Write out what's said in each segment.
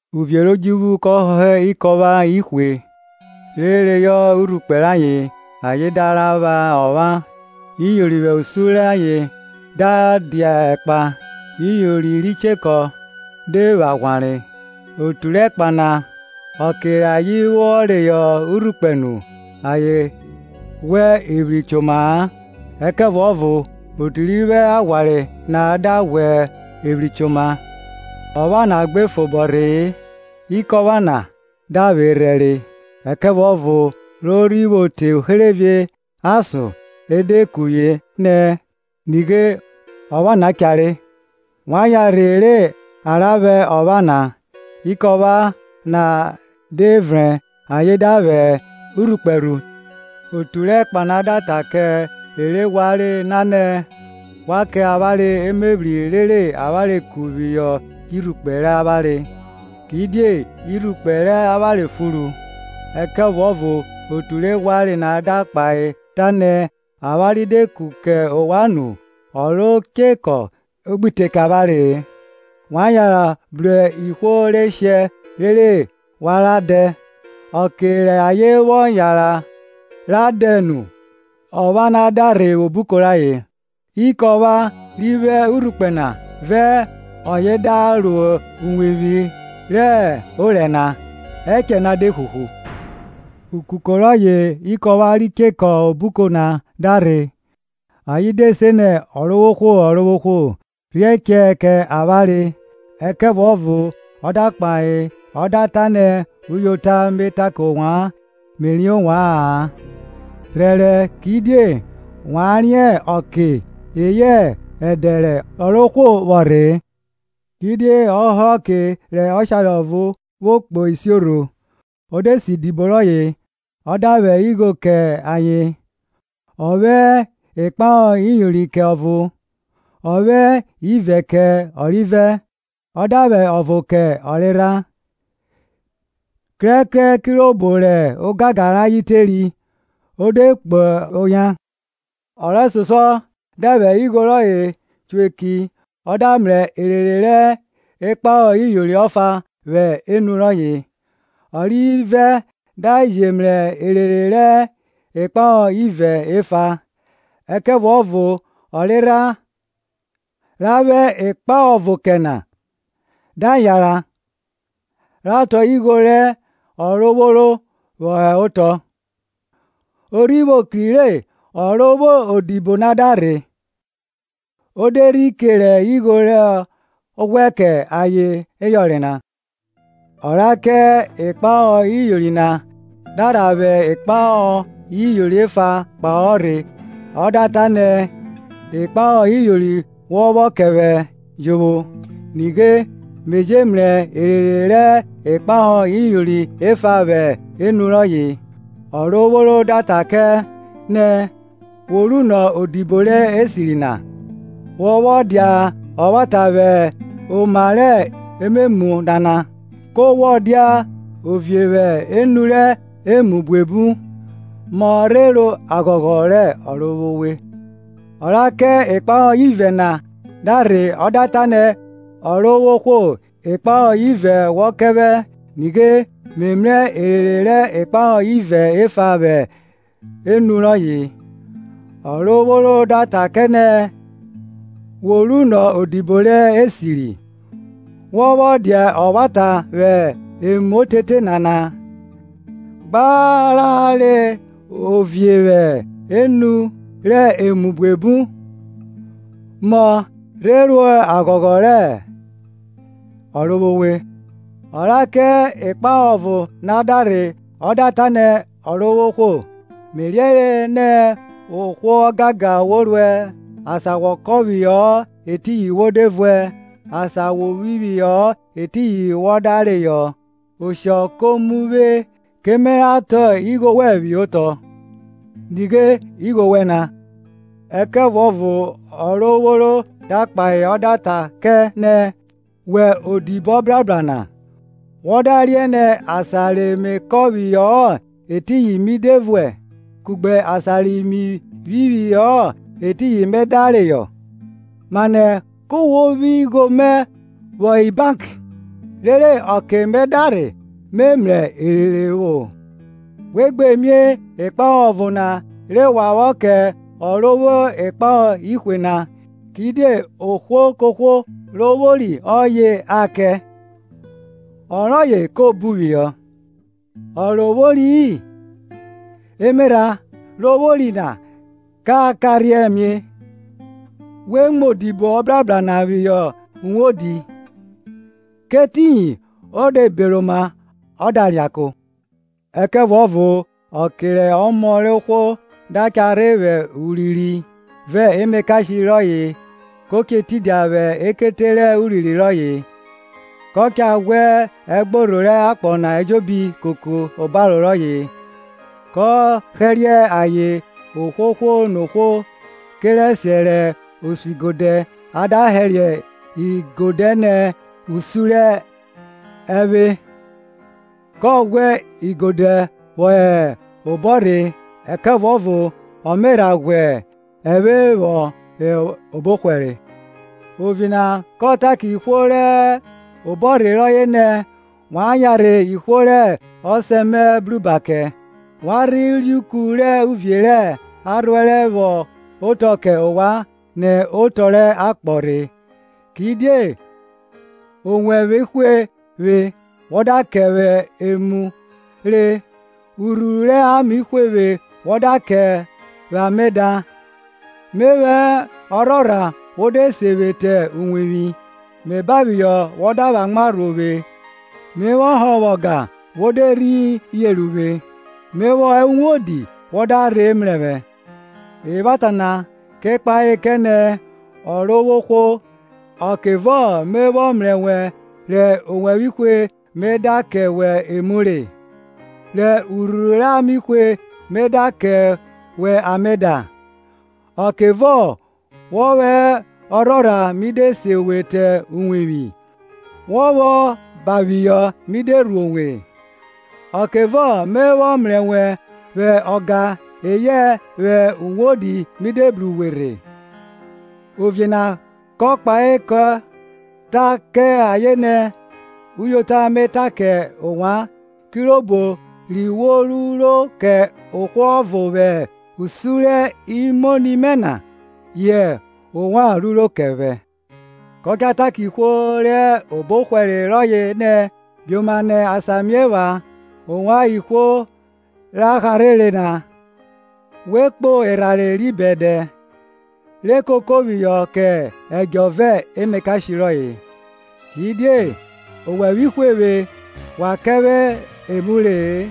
Uvie rẹ odjuvwu kọ họhọ ikọpha ihwe, re reyọ irhukpẹ rayen, ayen da ra vwa ọpha. Iyori vwẹ usun rẹ ayen da dia ẹkpa, iyori ri chekọ de vwọ aghwanre. Otu rẹ ẹkpa na, ọke rẹ ayen vwọ reyọ urhukpẹ nu, ayen ghwa evwri choma-a; Ẹkẹvuọvo otu ri vwo aghwanre na da ghwa evwri choma. Ọpha na gbe fobọ rhe-e, ikọpha na da vwerhẹ re. Ẹkẹvuọvọ ro rhi vwo te uherevie ason e de kuvwie nẹ, Nighe ọpha na cha re! Wa yanrhe re a ra vwa ọpha na. Ikọpha na de vrẹn, aye da vwẹ irhukpẹ rhu. Otu rẹ ẹkpa na da ta kẹ e re ghwanre na nẹ, Wa kẹ avwanre emevwri rere avwanre ku phihọ irhukpẹ rẹ avwanre, kidie irhukpẹ rẹ avwanre furu. Ẹkẹvuọvo otu re ghwanre na da kpahe ta nẹ, Avwanre de ku kẹ ovwan nu, ọ ro chekọ gbi te kẹ avwanre-e. Wa yanran bru ihwo re shẹ rere wa ra dẹ. Ọke rẹ ayen vwọ yanran ra dẹ nu, ọpha na da rhe vwẹ obuko rayen; ikọpha ri vwo urhukpẹ na vẹ ọye da ro uwevwi rẹ orẹ na; ẹchẹ na de huhu. Ukoko rọye ikọpha ri chẹkọ obuko na da rhe, ayen de se nẹ, Ọrovwohwo, Ọrovwohwo rhiẹ ẹchẹ kẹ avwanre. Ẹkẹvuọvo ọ da kpahe ọ da ta nẹ, Uyota me ta kẹ ovwan, Me riẹn ovwa-an. Rhẹrẹ kidie wa riẹn ọkẹ eyẹ ẹdẹ rẹ Ọrovwohwo vwọ rhe-e, Kidie ọ họhọ ọke rẹ ọshare ọvo vwo kpo isiorho, o de se idibo rọye, ọ da vwẹ ighọ kẹ ayen. Ọ vwẹ ikpahọ iyori kẹ ọvo, ọ vwẹ ivẹ kẹ ọrivẹ, ọ da vwẹ ọvo kẹ ọrerha, krẹkrẹ kirobo rẹ ogangan rayen teri; o de kpo oyan. Ọ rẹsosuọ da vwẹ igho rọye cho eki ọ da mrẹ erere rẹ ikpahọ iyori ọfa vwẹ enu rọye. Ọ rivẹ da je mrẹ erere rẹ ikpahọ ivẹ efa. Ẹkẹvuọvo ọ rerha ra vwẹ ikpahọ ọvo kẹ na, da yanran ra tọn igho rẹ ọrovworo vwọ họ otọ. O rhi vwo kri re ọ ro vwo odibo na da rhe, o de rhi kere igho rọ ghwẹ kẹ ayen yọnre na. Ọ ra kẹ ikpahọ iyori na, da rha vwẹ ikpahọ iyori efa kpahọ rhe ọ da ta nẹ, ikpaho iyori wọ vwọ kẹ vwẹ jovwo; nighe me je mrẹ erere rẹ ikpahọ iyori efa vwẹ enu rọye, Ọrovworo da ta kẹ nẹ, Wo runọ odibo rẹ esiri na; wọ vwọ dia ọvwata vwẹ oma rẹ ememu nana, ku wọ dia ovie vwẹ enu rẹ emu buebu; mọ rhe ro aghọghọ rẹ ọrovwowe. Ọ ra kẹ ikpahọ ivẹ na da rhe ọ da ta nẹ, Ọrovwohwo ikpahọ ivẹ wọ kẹ vwẹ; nighe me mrẹ erere rẹ ikpahọ ivẹ efa vwẹ enu rọye. Ọrovworo da ta kẹ nẹ, Wo runọ odibo rẹ esiri, wọ vwọ dia ọvwata vwẹ emu otete nana, gba ra re ovie vwẹ enu rẹ emu buebu; mọ rhe ro aghọghọ rẹ Ọrovwowe. Ọ ra kẹ ikpahọ ọvo na da rhe ọ da ta nẹ, Ọrovwohwo, Me riẹnre nẹ ohwo ọgangan wo ruẹ, asan wọ kọn phihọ-ọ etiyin wo de vuẹ, asan wo phihọ-ọ etiyin wọ da reyọ; Oshọ ko mu vwe ke me ra tọn igho wẹn phihọ otọ; nighe igho wẹn na. Ẹkẹvuọvo ọrovworo da kpahe ọ da ta kẹ nẹ, Wẹ odibo ọbrabra na, wọ da riẹn nẹ asan re me kọn phihọ-ọ etiyin mi de vuẹ kugbe asan ri mi phihọ-ọ etiyin me da reyọ? Mane ki wo phi igho mẹ vwọ hẹ bank, rere ọke me da rhe me mrẹ erere vwọ? We gbe mie ikpahọ ọvo na re wa vwọ kẹ ọ ro vwo ikpahọ ihwe na. Kidie ohwo kohwo ro vwori ọye a kẹ, ọroye ko bu phihọ; ọ ro vwori-i, emerha ro vwori na ka karhiẹn mie. We mu odibo ọbrahra na phihọ uwodi; kẹ etiyin o de beroma ọ da reako. Ẹkẹvuọvo ọke rẹ Ọmọ rẹ ohwo da cha rhe vwẹ urinrin, vẹ emakashe rọye, kọ che tidia vwẹ ekete rẹ urinrin rọye. Ka cha ghwẹ ẹgborho rẹ akpọ na ejobi koko obaro rọye; ko hẹriẹ ayen ohwohwo nohwo kerẹsiẹ rẹ osuigodẹ a da hẹriẹ igode nẹ usun rẹ ẹvwe. Kọ ghwẹ igodẹ vwọ hẹ obọrhe, ẹkẹvuọvo ọ me rha ghwẹ ẹvwe vwọ hẹ obọhwẹre. Ovie na kọ ta kẹ ihwo re hẹ obọrhe rọye nẹ, Wa yanrhe ihwo rẹ ọsẹ mẹ bruba kẹ, wa rhe reuku rẹ uvie ra rhuẹrẹ vwọ otọ kẹ ovwan nẹ otọ rẹ akpọ rhe. Kidie owẹvwe hwe vwe wọ da kẹ vwẹ emu re; urhuru rẹ ame hwe vwe wọ da kẹ vwẹ ame da; me vwọ hẹ ọrhorha wo de se vwe te uwevwi; Me banphihọ wọ da vwẹ amwa rhuo vwe; me vwọ hovwa ọga wo de rhi yenre uvwe; me vwọ hẹ uwodi wọ da rhe mrẹ vwẹ. Evwata na kẹ kpahe kẹ nẹ, Ọrovwohwo, ọkevọ me vwọ mrẹ wẹ rẹ owẹvwe hwe we me da kẹ wẹ emu re? rẹ urhuru rẹ ame hwe we me da kẹ wẹ ame da? Ọkevọ wọ vwọ hẹ ọrhorha mi de se we ro uwevwi? wọ vwọ banphihọ mi de rhuo we? Ọkevọ me vwọ mrẹ wẹ vwẹ ọga eyẹ vwẹ uwodi mi de bru uwe rhe? Ovie na kọ kpahe kọ ta kẹ ayen nẹ, Uyota me ta kẹ ovwan, kirobo ri we ruro kẹ ohwo ọvo vwẹ usun rẹ imoni mẹ na, yẹ ovwan ruro kẹ vwẹ. Kọ cha ta kẹ ihwo re hẹ obọhwẹre rọye nẹ, Bioma nẹ asan mie epha, ovwan ihwo ra harhere na, vwo kpo erhanre ri bẹdẹ re koko phihọ kẹ ẹdjọ vẹ emakashe rọye. Kidie owẹvwe hwe vwe wa kẹ vwẹ emu re-e;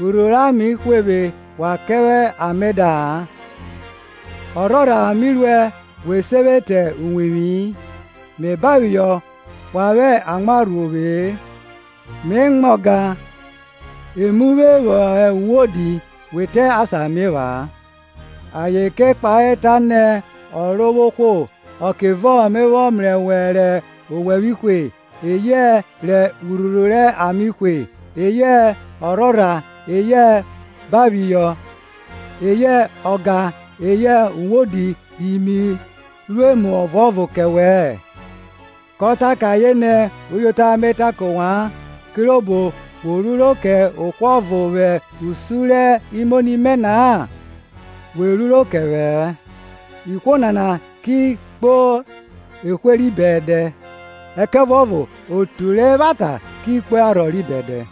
urhuru rẹ ame hwe vwe wa kẹ vwẹ ame da-a; ọrhorha mi ruẹ we se vwe te uwevwi-i, me banphihọ wa vwẹ amwa rhuo vwe-e; me mwa ọga, e mu vwe vwọ hẹ uwodi we te asan mie epha-a. Ayen ke kpahe ta nẹ, Ọrovwohwo, ọkevọ me vwọ mrẹ wẹ rẹ owevwe hwe, eyẹ rẹ urhuru rẹ ame hwe, eyẹ ọrhorha, eyẹ rẹ ọ banphihọ, eyẹ rẹ ọ mua ọga eyẹ rọ hẹ uwodi ri mi ru emu ọvuọvo kẹ wẹ-ẹ? Kọ ta kẹ ayen nẹ, Uyota me ta kẹ ovwan, kirobo we ruro kẹ ohwo ọvo vwẹ usun rẹ imoni mẹ na-a, we ruro kẹ vwẹ-ẹ. Ihwo nana ki kpo ehwe ri bẹdẹ ẹkẹvuọvo otu rẹ evwata ki kpo arhọ ri bẹdẹ.